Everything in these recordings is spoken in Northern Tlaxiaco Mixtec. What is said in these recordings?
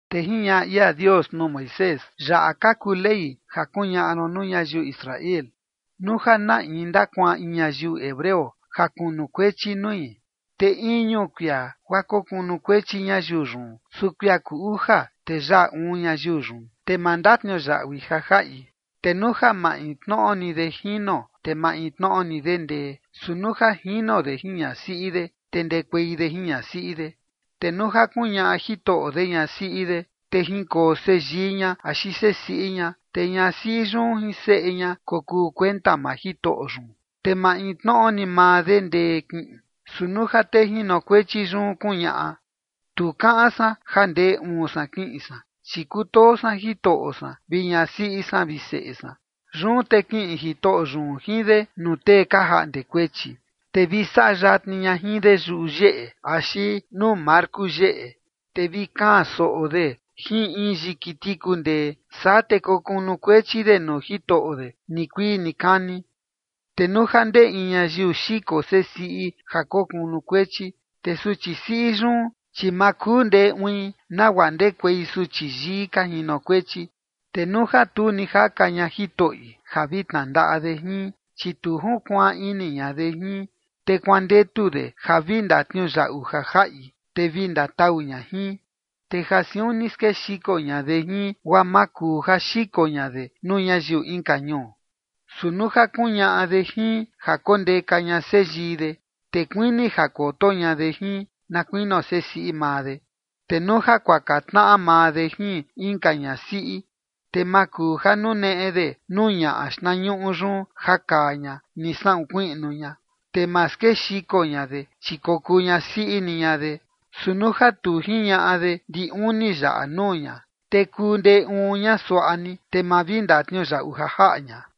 Te jiñaꞌa ia Dios nuu Moisés: ―Yaꞌa ka kuu ley ja kuñaꞌa ron nuu ñayiu Israel: Nuu ja na in ndakuaan in ñayiu hebreo ja kunukuechi nui, te iñu kuia guaa kokunukuechi ñayiu yun, su kuia kuu uja te yaꞌa uun ñayiu yun, te ma ndatniuyaꞌui ja jaꞌi. Te nuu ja maintnoꞌo ni de jino, te maintnoꞌo ni de ndee, su nuu ja jino de jin ñasiꞌi de, te ndekuei de jin ñasiꞌi de. Te nuu ja kuñaꞌa jitoꞌo de ñasiꞌi de, te jinkoo seyii ña axi sesiꞌi ña, te ñasiꞌi yun jin seꞌe ña kokuu kuenta maa jitoꞌo yun, te maintnoꞌo ni maa de ndee kiꞌin. Su nuu ja tee jinokuechi yun kuñaꞌa: “Tu kaꞌan san ja ndee uun san kiꞌin san, chi kutoo san jitoꞌo san vi ñasiꞌi san vi seꞌe san”. Yun te kiꞌin jitoꞌo yun jin de nuu tee ka jaꞌnde kuechi, te vi saꞌa yatni ña jin de yuyeꞌe axi nuu marku yeꞌe, te vi kaan soꞌo de jin in yiki tiku ndee. Saa te kokunukuechi de nuu jitoꞌo de nikuii nikani. ’Te nuu ja ndee in ñayiu xiko sesiꞌi ja kokunukuechi, te suchi siꞌi yun, chi ma kuu ndee uin nagua ndekuei suchi yii ka jinokuechi. Te nuu ja tu ni jaka ña jitoꞌi ja vi tnandaꞌa de jin, chi tu junkuaan ini ña de jin, te kuandetu de ja vi ndatniuyaꞌu ja jaꞌi, te vi ndatau ña jin. Te ja siun ni skexiko ña de jin guaa ma kuu ja xiko ña de nuu ñayiu inka ñuu. Su nuu ja kuñaꞌa de jin ja kondeka ña seyii de, te kuini ja koto ña de jin na kuinio sesiꞌi maa de. Te nuu ja kuaka tnaꞌa maa de jin inka ñasiꞌi, te ma kuu ja nuneꞌe de nuu ñaꞌa xtnañuꞌu yun ja kaa ña ni saꞌun kuiꞌnu ña, te ma skexiko ña de, chi kokuu ñasiꞌi ni ña de. Su nuu ja tu jiñaꞌa de ndi uni yaꞌa nuu ña, te kuu ndee uun ña suaꞌa ni, te ma vi ndatniuyaꞌu ja jaꞌa ña.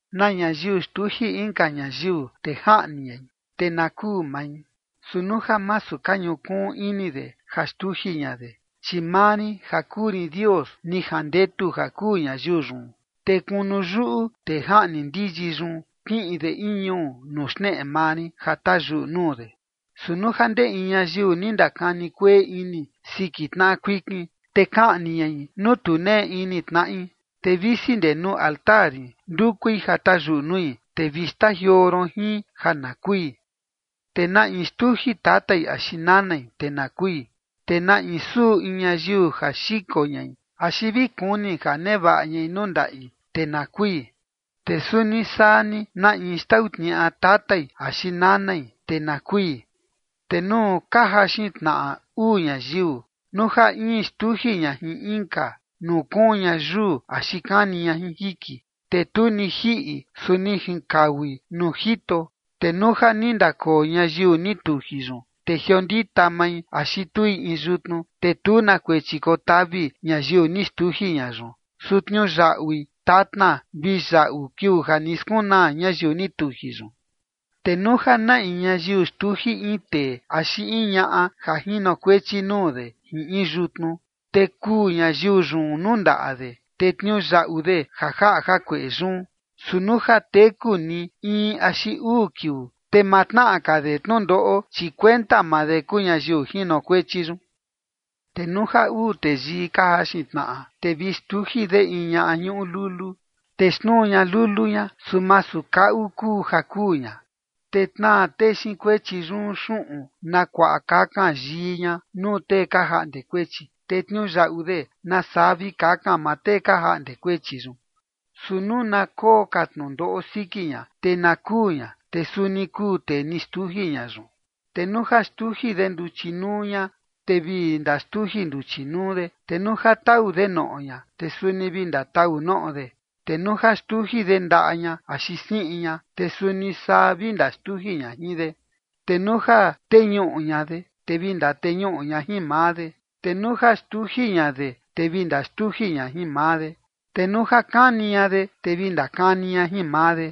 ’Na ñayiu xtuji inka ñayiu te jaꞌni ñai, te na kuu mai. Su nuu ja masu ka ñukuun ini de ja xtuji ña de, chi maa rin ja kuu rin Dios ni jandetu ja kuu ñayiu yun, te kunu yuꞌu tee jaꞌni ndiyi yun, kiꞌin de in ñuu nuu xneꞌe maa rin ja tayuꞌu nuu de. Su nuu ja ndee in ñayiu ni ndakani kueꞌe ini siki tnaꞌa kuikin, te kaꞌni ñai nuu tu nee ini tnaꞌi, te visi ndee nuu altar rin ndukui ja tayuꞌu nui, te vi xtajioo ron jin ja na kui. ’Te na in xtuji tatai axi nanai, te na kui. ’Te na in suꞌu in ñayiu ja xiko ñai axi vi kuni ja nevaꞌa ñai nuu ndaꞌi, te na kui. ’Te suni saa ni na in xtau tniaꞌa tatai axi nanai, te na kui. ’Te nuu ka jaxin tnaꞌa uu ñayiu, nuu ja in xtuji ña jin inka, nuu kuun ña yuu axi kani ña jin jiki, te tu ni jiꞌi, su ni jinkaui nuu jito, te nuu ja ni ndakoo ñayiu ni tuji yun, te jiondita mai axi tui in yutnu, te tu na kuechi kotavi ñayiu ni xtuji ña yun, su tniuyaꞌui tatna vi yaꞌu kiuu ja ni skunaa ñayiu ni tuji yun. ’Te nuu ja na in ñayiu xtuji in tee axi in ñaꞌa ja jinokuechi nuu de jin in yutnu, te kuu ñayiu yun nuu ndaꞌa de, te tniuyaꞌu de ja jaꞌa jakueꞌe yun. Su nuu ja teku ni in axi uu kiuu, te ma tnaꞌa ka de tnundoꞌo, chi kuenta maa de kuu ñayiu jinokuechi yun. ’Te nuu ja uu teyii ka jaxin tnaꞌa, te vi xtuji de in ñaꞌa ñuꞌu lulu, te xnuu ña lulu ña, su masu kaꞌu kuu ja kuu ña, te tnaa tee xiin kuechi yun xuꞌun na kuaꞌa kakan yii ña nuu tee ka jaꞌnde kuechi, te tniuyaꞌu de nasaa vi kaꞌan maa tee ka jaꞌnde kuechi yun. Su nuu na koo ka tnundoꞌo siki ña, te na kuu ña, te suni kuu tee ni xtuji ña yun. Te nuu ja xtuji de nduchi nuu ña, te vi ndaxtuji nduchi nuu de. Te nuu ja tau de noꞌo ña, te suni vi ndatau noꞌo de. Te nuu ja xtuji de ndaꞌa ña axi siꞌin ña, te suni saa ni vi ndaxtuji ña jin de. Te nuu ja teñuꞌu ña de, te vi ndateñuꞌu ña jin maa de. Te nuu ja xtuji ña de, te vi ndaxtuji ña jin maa de. Te nuu ja kani ña de, te vi ndakani ña jin maa de.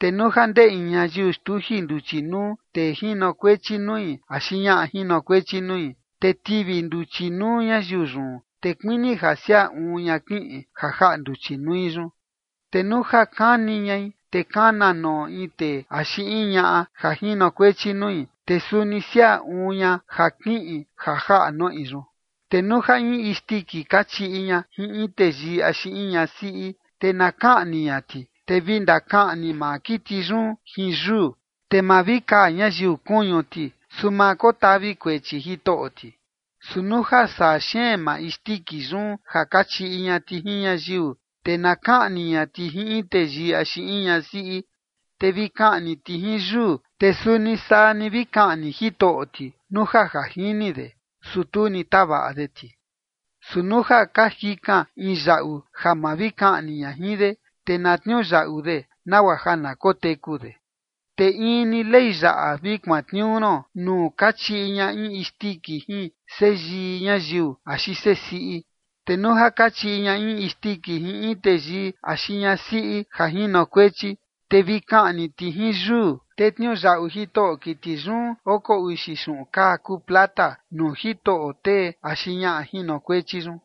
’Te nuu ja ndee in ñayiu xtuji nduchi nuu tee jinokuechi nui axi ñaꞌa jinokuechi nui, te tivi nduchi nuu ñayiu yun, te kuini ja siaa uun ña kiꞌin ja jaꞌa nduchi nui yun. Te nuu ja kani ñai te kana noꞌo in tee axi in ñaꞌa ja jinokuechi nui, te suni siaa uun ña ja kiꞌin ja jaꞌa noꞌi yun. ’Te nuu ja in isndiki kachiꞌi ña jin in teyii axi in ñasiꞌi, te na kaꞌni ña ti, te vi ndakaꞌni maa kiti yun jin yuu, te ma vi kaa ñayiu kuñu ti, su ma kotavi kuechi jitoꞌo ti. Su nuu ja saa xeen maa isndiki yun ja kachiꞌi ña ti jin ñayiu, te na kaꞌni ña ti jin in teyii axi in ñasiꞌi, te vi kaꞌni ti jin yuu. Te suni saa ni vi kaꞌni jitoꞌo ti nuu ja ja jini de, su tu ni tavaꞌa de ti. Su nuu ja ka jikan in yaꞌu ja ma vi kaꞌni ña jin de, te na tniuyaꞌu de nagua ja na koteku de. Te in ni ley yaꞌa vi kuantniuu ron nuu kachiꞌi ña in isndiki jin seyii ñayiu axi sesiꞌi. Te nuu ja kachiꞌi ña in isndiki jin in teyii axi ñasiꞌi ja jinokuechi, te vi kaꞌni ti jin yuu, te tniuyaꞌu jitoꞌo kiti yun oko uxi xuꞌun kaa kuu plata nuu jitoꞌo tee axi ñaꞌa jinokuechi yun.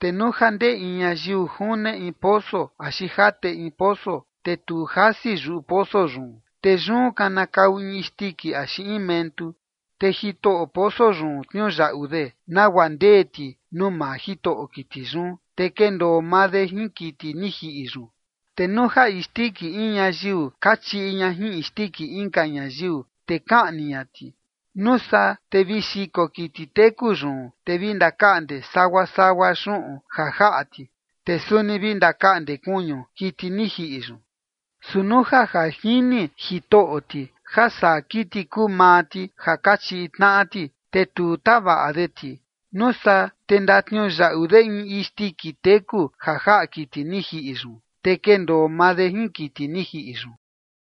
’Te nuu ja ndee in ñayiu june in poso axi jate in poso, te tu jasi yuꞌu poso yun, te yun kanakau in isndiki axi in mentu, te jitoꞌo poso yun tniuyaꞌu de nagua ndee ti nuu maa jitoꞌo kiti yun, te kendoo maa de jin kiti ni jiꞌi yun. ’Te nuu ja isndiki in ñayiu kachiꞌi ña jin isndiki inka ñayiu, te kaꞌni ña ti, nuu saa te vi xiko kiti teku yun, te vi ndakaꞌnde sagua sagua xuꞌun ja jaꞌa ti, te suni vi ndakaꞌnde kuñu kiti ni jiꞌi yun. Su nuu ja ja jini jitoꞌo ti ja saa kiti kuu maa ti ja kachiꞌi tnaꞌa ti, te tu tavaꞌa de ti, nuu saa te ndatniuyaꞌu de in isndiki teku ja jaꞌa kiti ni jiꞌi yun, te kendoo maa de jin kiti ni jiꞌi yun.